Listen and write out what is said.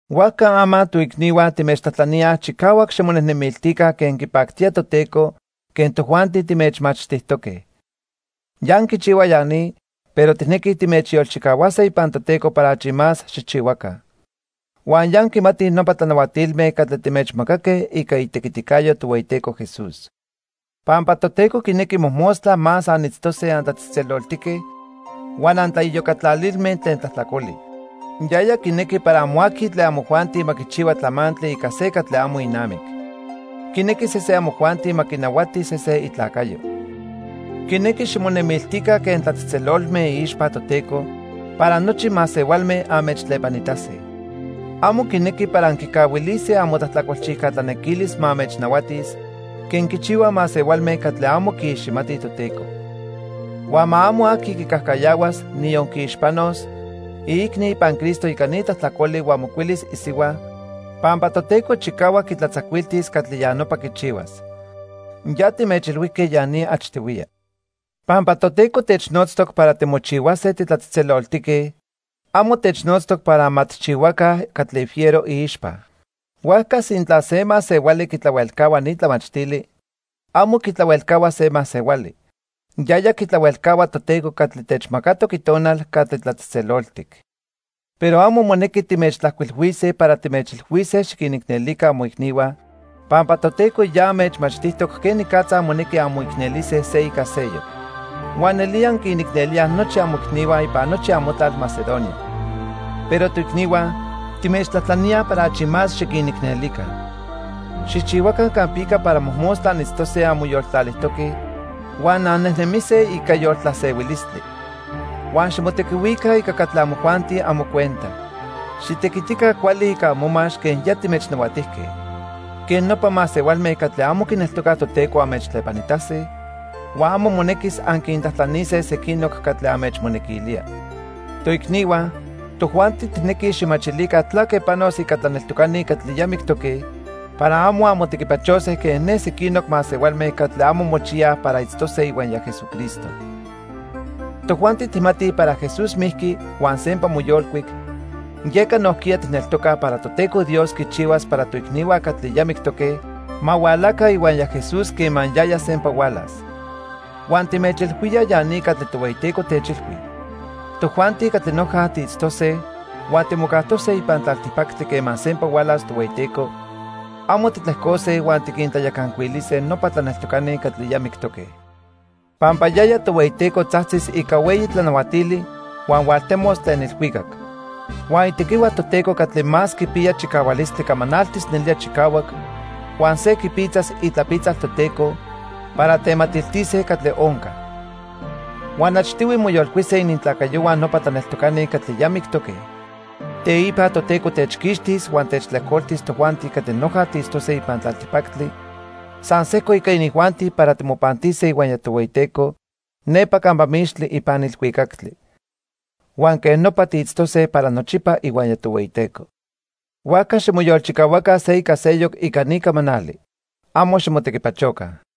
Huajca ama, toicnihua timechtlajtlaníaj chicahuac ximonejnemiltica quen quipactía Toteco quen tojuanti timechmachtijtoque. Ya anquichihuaj ya ni, pero tijnequij timechyolchicahuase ipan Toteco para achi más xijchihuaca. Huan ya anquimatij nopa tlanahuatilme catli timechmacaque ica itequiticayo Tohueyiteco Jesús. Pampa Toteco quinequi mojmostla más anitztose antlatzejtzeloltique huan antlaiyocatlalilme tlen tlajtlacoli. Yaya quinequi para amo aqui tlen amojuanti ma quichihua tlamantli ica se catli amo inamic. Quinequi sesen amojuanti ma quinahuati se se itlacayo. Quinequi ximonemiltica quen tlatzejtzelolme iixpa Toteco para nochi masehualme anmechtlepanitase. Amo quinequi para anquicahuilise amotlajtlacolchijca tlanequilis ma anmechnahuatis quen quichihuaj masehualme catli amo quiiximatij Toteco. Huan ma amo aqui quicajcayahuas, niyon quiixpanos, iicni ipan Cristo ica ni tlajtlacoli huan mocuilis isihua, pampa Toteco chicahuac quitlatzacuiltis catli ya nopa quichihuas. Ya timechilhuijque ya ni achtihuiya. Pampa Toteco technotztoc para timochihuase titlatzejtzeloltique, amo technotztoc para ma tijchihuaca catli fiero iixpa. Huajca sintla se masehuali quitlahuelcahua ni tlamachtili, amo quitlahuelcahua se masehuali; yaya quitlahuelcahua Toteco catli techmacatoc Itonal catli tlatzejtzeloltic. Pero amo monequi timechtlajcuilhuise para timechilhuise xiquinicnelica amoicnihua, pampa Toteco ya anmechmachtijtoc quenicatza monequi anmoicnelise se ica seyoc. Huan nelía anquinicnelíaj nochi amoicnihua ipan nochi amotlal Macedonia. Pero toicnihua, timechtlajtlaníaj para achi más xiquinicnelica. Xijchihuaca campica para mojmostla anitztose anmoyoltlalijtoque huan annejnemise ica yoltlasehuilistli. Huan ximotequihuica ica catli amojuanti amocuenta. Xitequitica cuali ica amomax quen ya timechnahuatijque. Quej nopa masehualme catli amo quineltocaj Toteco anmechtlepanitase, huan amo monequis anquintlajtlanise sequinoc catli anmechmonequilía. Toicnihua, tojuanti tijnequij xijmachilica tlaque panos ica tlaneltocani catli ya mictoque para amo anmotequipachose quen ne sequinoc masehualme catli amo mochiyaj para itztose ihuaya Jesucristo. Tojuanti tijmatij para Jesús mijqui huan sempa moyolcuic, yeca nojquiya tijneltocaj para Toteco Dios quichihuas para toicnihua catli ya mictoque ma hualaca ihuaya Jesús quema yaya sempa hualas. Huan timechilhuíaj ya ni catli Tohueyiteco techilhui. Tojuanti catli noja tiitztose huan timocajtose ipan tlaltipactli quema sempa hualas Tohueyiteco, amo titlejcose huan tiquintlayacancuilise nopa tlaneltocani catli ya mictoque. Pampa yaya Tohueyiteco tzajtzis ica hueyi tlanahuatili huan hualtemos tlen ilhuicac. Huan itequihua Toteco catli más quipiya chicahualistli camanaltis nelía chicahuac huan se quipitzas itlapitzal Toteco para tematiltise catli onca. Huan achtihui moyolcuise inintlacayohua nopa tlaneltocani catli ya mictoque. Teipa Toteco techquixtis huan techtlejcoltis tojuanti catli noja tiitztose ipan tlaltipactli san sejco ica inijuanti para timopantise ihuaya Tohueyiteco nepa campa mixtli ipan ilhuicactli. Huan quej nopa tiitztose para nochipa ihuaya Tohueyiteco. Huajca ximoyolchicahuaca se ica seyoc ica ni camanali. Amo ximotequipachoca.